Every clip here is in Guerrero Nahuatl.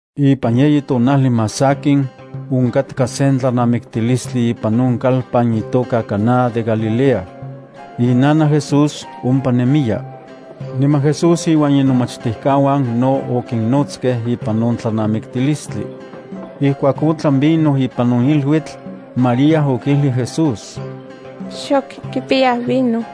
Ipan yeyi tonajli más sakin, onkatka sen tlanamiktilistli ipan on kalpan itoka Caná de Galilea. Inanaj Jesús ompa nemiya. Niman Jesús iuan inomachtijkauan no okinnotskej ipan on tlanamiktilistli. Ijkuak otlan vino ipan on iluitl, María okijlij Jesús: —Xok kipiyaj vino.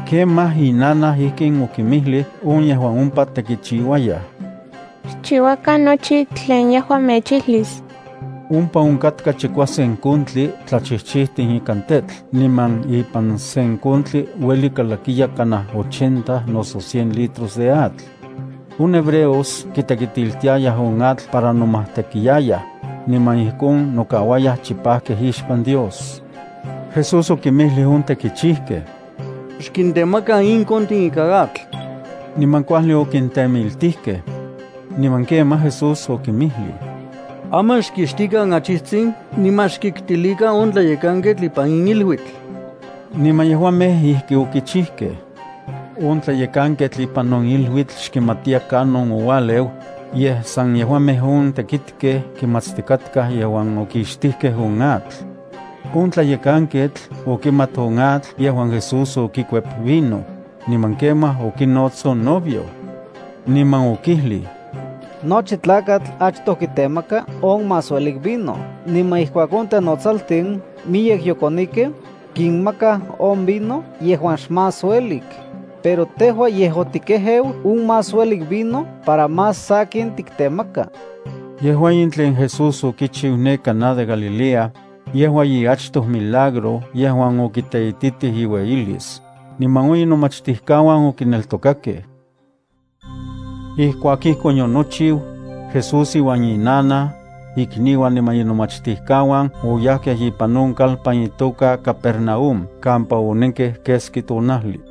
Kemaj inanaj ijkin okinmijlij on yejuan ompa tekichiuayaj: —Xchiuakan nochi tlen yejua mechijlis. Ompa onkatkaj chikuasen kontin tlachijchijtin ikan tetl niman ipan sen kontli ueli kalakiya kanaj ochenta noso cien litros de atl. On hebreos kitekitiltiayaj on atl para nomajtekiayaj, niman ijkon nokauayaj chipajkej ixpan Dios. Jesús okinmijlij on tekichijkej: —Xkintemakan in kontin ikan atl. Niman kuajli okintemiltijkej. Niman kemaj Jesús okinmijlij: —Aman xkixtikan achijtsin niman xkitkilikan on tlayekanketl ipan in iluitl. Niman yejuamej ijki okichijkej. On tlayekanketl ipan on iluitl xkimatiya kanon oualeu, yej san yejuamej on tekitkej kimatstikatkaj yejuan okixtijkej on atl. On tlayekanketl okimat on atl yejuan Jesús okikuep vino, niman kemaj okinots on novio, niman okijlij: —Nochi tlakatl achtoj kitemaka on más uelik vino niman ijkuak on tenotsaltin miyek yokonikej, kinmakaj on vino yejuan xmás uelik. Pero tejua yej otikejeu on más uelik vino para más sakin tiktemaka. Yejua in tlen Jesús okichiu ne Caná de Galilea, yejua iachtoj milagro yejuan okiteititij iueyilis, niman on inomachtijkauan okineltokakej. Ijkuak ijkon yonochiu, Jesús iuan inanaj, ikniuan niman inomachtijkauan oyajkej ipan on kalpan itoka Capernaúm kampa onenkej keski tonajli.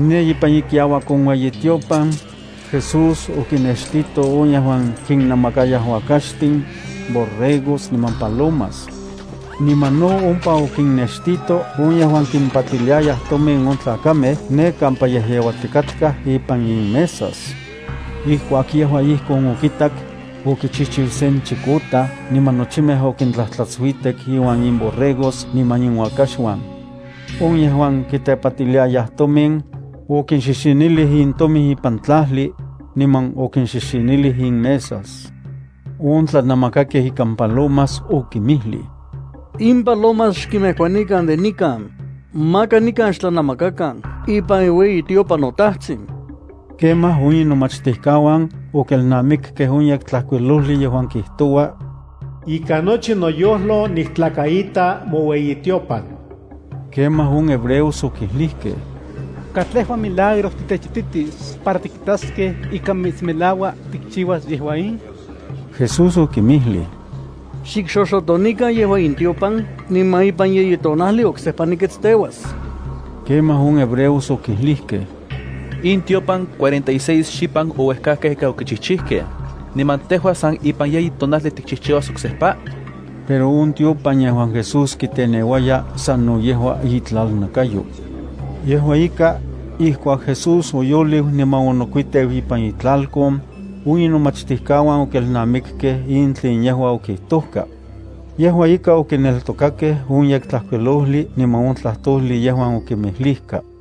Ne ipan ikiauak on ueyitiopan, Jesús okinnextito on yejuan kinnamakayaj uakaxtin, borregos niman palomas. Niman no ompa okinnextito on yejuan kimpatiliayaj tomin on tlakamej ne kampa yejyeuatikatkaj ipan inmesas. Ijkuak yejua ijkon okitak, okichijchiu sen chikotaj niman nochimej okintlajtlatsuitek iuan inborregos niman inuakaxuan. On yejuan kitepatiliayaj tomin, okinxixinilij intomin ipan tlajli, niman okinxixinilij inmesa. On tlanamakakej ikan palomas okinmijlij: —¡In palomas xkinmejkuanikan de nikan! ¡Maka nikan xtlanemakan ipan iueyitiopan noTajtsin! Kemaj on inomachtijkauan okelnamikkej on Yektlajkuilojli yejuan kijtoua: “Ikan nochi noyojlo niktlakaita moueyitiopan.” Kemaj on hebreos okijlijkej: —¿Katlejua milagro titechititis para tikitaskej ika mitsmelaua tikchiuas yejua in? Jesús okinmijlij: —Xikxoxotonikan yejua in tiopan niman ipan yeyi tonajli oksejpa niketsteuas. Kemaj on hebreos okijlijkej: —In tiopan cuarenta y seis xipan ouejkajkej ika okichijchijkej, ¿niman tejua san ipan yeyi tonajli tikchijchiuas oksejpa? Pero on tiopan yejuan Jesús kiteneuaya sano yejua itlalnakayo. Yejua ika, ijkuak Jesús oyoliu niman onokuiteu ipan itlalkon, on inomachtijkauan okelnamikkej in tlen yejua okijtojka. Yejua ika okineltokakej on Yektlajkuilojli niman on tlajtojli yejuan okinmijlijka.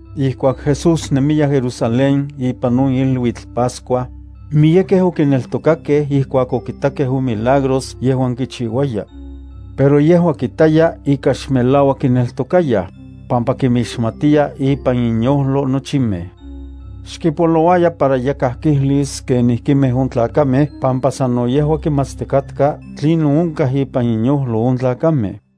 Ijkuak Jesús nemiya Jerusalén ipan on iluitl Pascua, miyekej okineltokakej ijkuak okitakej on milagros yejuan kichiuaya. Pero yejua kitaya ika xmelauak kineltokayaj, pampa kinmixmatiya ipan inyojlo nochimej. Xkipolouaya para yakaj kijlis kenijkimej on tlakamej pampa sano yejua kimatstikatka tlinon onkaj ipan inyojlo on tlakamej.